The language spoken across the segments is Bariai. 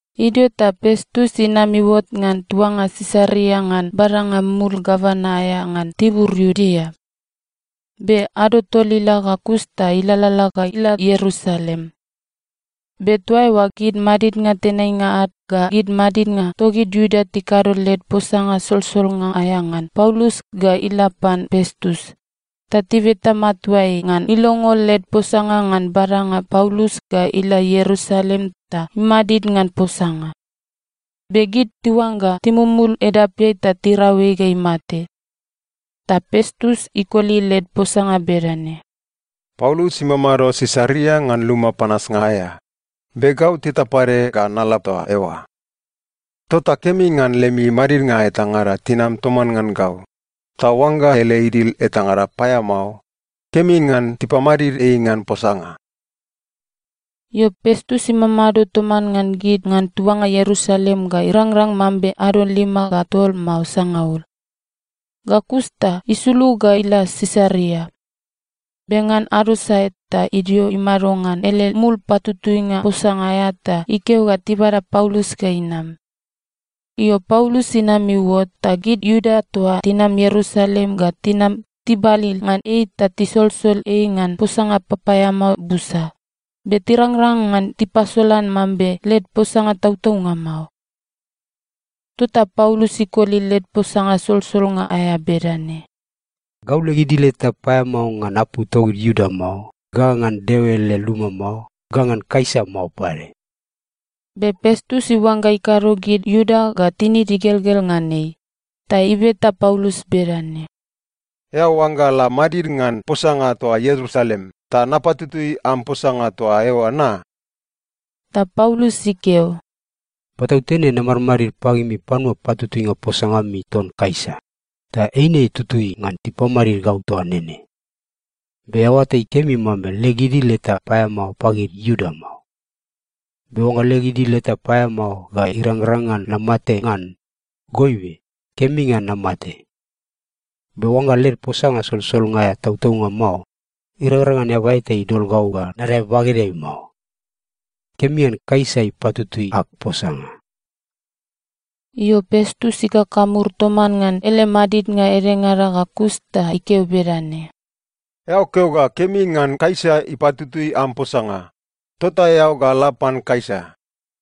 Idio ta Pestus inam iuot ngan tuanga Sisaria ngan badanga mul gavana aea ngan tibur Iudea. Be ado tol ila ga kus ta ilalala ga ila Ierusalem. Be toa eoa gid madidnga tenainga ad ga gid madidnga togid Iuda tikado led posanga solsolnga aea ngan Paulus ga ila pan Pestus, ta tibeta matua ei ngan ilongo led posanga ngan badanga Paulus ga ila Ierusalem ta imadid ngan posanga. Be gid tiuangga timumul edapeai ta tirau ei ga imate. Ta Pestus ikoli led posanga bedane, “Paulus imamado Sisaria ngan luma panasnga aea, be gau teta pade ga nala toa eoa. Tota kemi ngan lemi madidnga etangada tinam toman ngan gau, ta oangga ele idil etangada paeamao, kemi ngan tipamadid ei ngan posanga.” Io, Pestus imamado toman ngan gid ngan tuanga Ierusalem ga irangrang mambe ado lima ga tol mao sangaul. Ga kus ta isulug ga ila Sisaria. Be ngan ado sae ta idio imado ngan ele mul patutuinga posanga aea ta ikeo ga tibada Paulus ga inam. Io, Paulus inam iuot, ta gid Iuda toa tinam Ierusalem ga tinam tibalil ngan ei ta tisolsol ei ngan posanga papaeamao busa, be tirangrang ngan tipasolan mambe led posanga tautaunga mao. Tota Paulus ikoli led posanga solsolnga aea bedane, “Gau leg idil eta paeamao ngan apu togid Iuda mao, ga ngan Deo ele luma mao, ga ngan Kaisa mao pade.” Be Pestus iuangga ikado gid Iuda ga tinid igelgel ngan ei, ta ibeta Paulus bedane, “Eao oangga la madid ngan posanga toa Ierusalem, ta napatutui am posanga toa eoa na?” Ta Paulus ikeo, “Patautene namadmadid pagimi panua patutuinga posanga ami ton Kaisa, ta eine tutui ngan tipamadid gau toa nene. Be eao oatai kemi mambe leg idil eta paeamao pagid Iuda mao. Be oangga leg idil eta paeamao ga irangrang ngan namate ngan, goibe kemi ngan namate. Be oangga led posanga solsolnga aea tautaunga mao, irangrang ngan eaba eta idol gau ga nadae bagedeai mao. Kemi ngan Kaisa ipatutui ag posanga!” Io, Pestus ikakamur toman ngan ele madidnga edengada ga kus ta ikeo bedane, “Eao keo ga kemi ngan Kaisa ipatutui am posanga, tota eao ga la pan Kaisa.”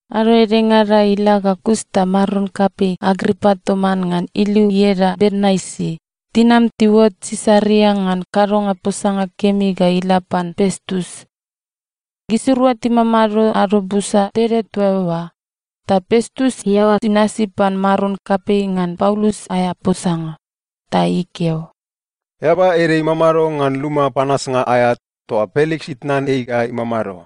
Ado edengada ila ga kus ta maron kapei Agripa toman ngan iliu ieda Bernaisi tinam tiuot Sisaria ngan kadonga posanga kemi ga ila pan Pestus. Gisirua timamado ado busa tede toa eoa, ta Pestus iaoa inasi pan maron kapei ngan Paulus aea posanga. Ta ikeo, “Eaba ede imamado ngan luma panasnga aea toa Peliks itnan ei ga imamado.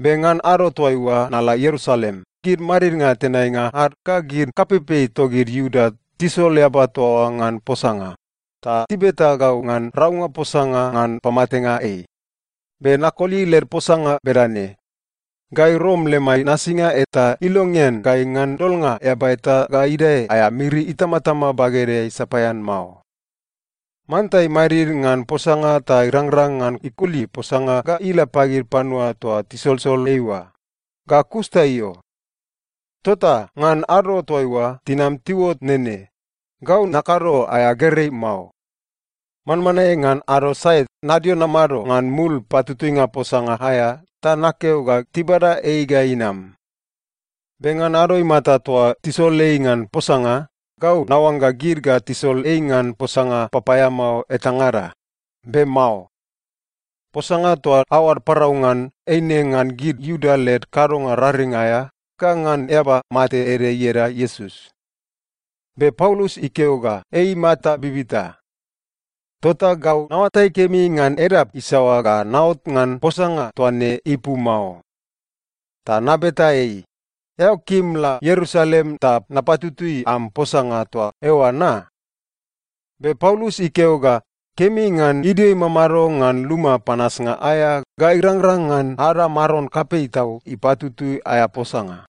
Be ngan ado toaiua nala Ierusalem, gid madidnga tenainga ad ga gid kapeipei togid Iuda tisol eaba toa oa ngan posanga ta tibeta gau ngan raunga posanga ngan pamatenga ei. “Be nakoli led posanga bedane, ‘Gai Rom lemai nasinga eta ilongean gai ngan dolnga eaba eta ga idae aea miri itamatama bagedeai sapaean mao. Manta imadid ngan posanga ta irangrang ngan ikoli posanga ga ila pagid panua toa tisolsol ei oa, ga kus ta io.’ Tota ngan ado toaiua tinam tiuot nene, gau nakado aea gerei mao. Manmanae ngan ado sae nadio namado ngan mul patutuinga posanga aea ta nakeo ga tibada ei ga inam. Be ngan ado imata toa tisol ei ngan posanga, gau naoangga gid ga tisol ei ngan posanga papaeamao etangada. Be mao. Posanga toa aoad parau ngan, eine ngan gid Iuda led kadonga raring aea ga ngan eaba mate ede ieda Iesus. Be Paulus ikeo ga ei imata bibita. Tota gau naoatai kemi ngan edap isaoa ga naot ngan posanga toa ne ipu mao. Ta nabeta ei, ‘Eao kim la Ierusalem ta napatutui am posanga toa eoa na?’ Be Paulus ikeo ga kemi ngan idio imamado ngan luma panasnga aea ga irangrang ngan ada maron kapei tau ipatutui aea posanga.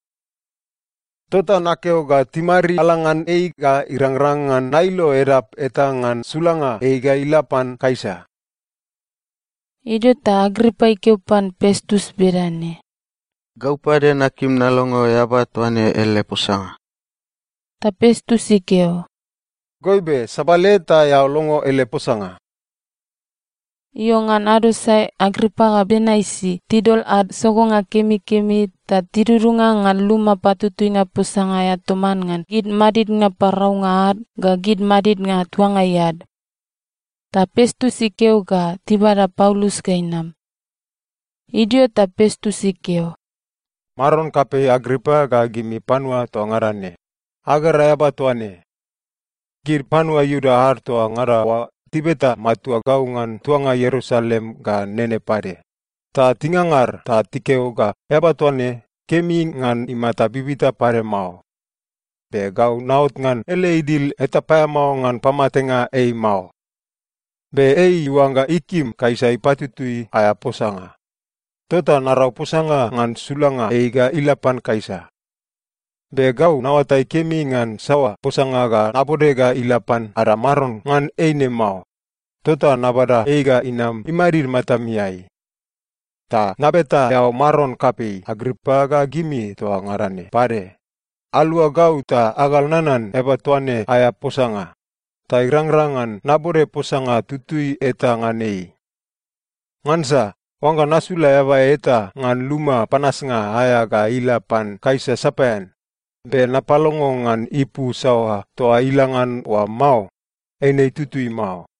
Tota nakeo ga timariala ngan ei ga irangrang ngan nailo edap eta ngan sulanga ei ga ila pan Kaisa.” Idio ta Agripa ikeo pan Pestus bedane, “Gau pade nakim nalongo eaba toa ne ele posanga.” Ta Pestus ikeo, “Goibe, sabale ta eao longo ele posanga.” Io, ngan ado sae Agripa ga Bernaisi tidol ad sogonga kemikemi ta tidudunga ngan luma patutuinga posanga aea toman ngan gid madidnga paraunga ad ga gid madidnga tuangai ad. Ta Pestus ikeo ga tibada Paulus ga inam. Idio ta Pestus ikeo, “Maron kapei Agripa ga gimi panua toa ngada ne, agera eaba toa ne. Gid panua Iuda ad toa ngada oa tibeta matua gau ngan tuanga Ierusalem ga nene pade, ta tingangar ta tikeo ga eaba toa ne, kemi ngan imata bibita pade mao. Be gau naot ngan ele idil eta paeamao ngan pamatenga ei mao. Be ei iuangga ikim Kaisa ipatutui aea posanga, tota narau posanga ngan sulanga ei ga ila pan Kaisa. Be gau naoatai kemi ngan saoa posanga ga nabode ga ila pan ada maron ngan ei ne mao. Tota nabada ei ga inam imadid matamiai. Ta nabeta eao maron kapei Agripa ga gimi toa ngada ne pade, alua gau ta agal nanan eaba toa ne aea posanga, ta irangrang ngan nabode posanga tutui eta ngan ei. Ngansa oangga nasula eaba eta ngan luma panasnga aea ga ila pan Kaisa sapaean, be napalongo ngan ipu saoa toa ila ngan oa mao, eine itutui mao.”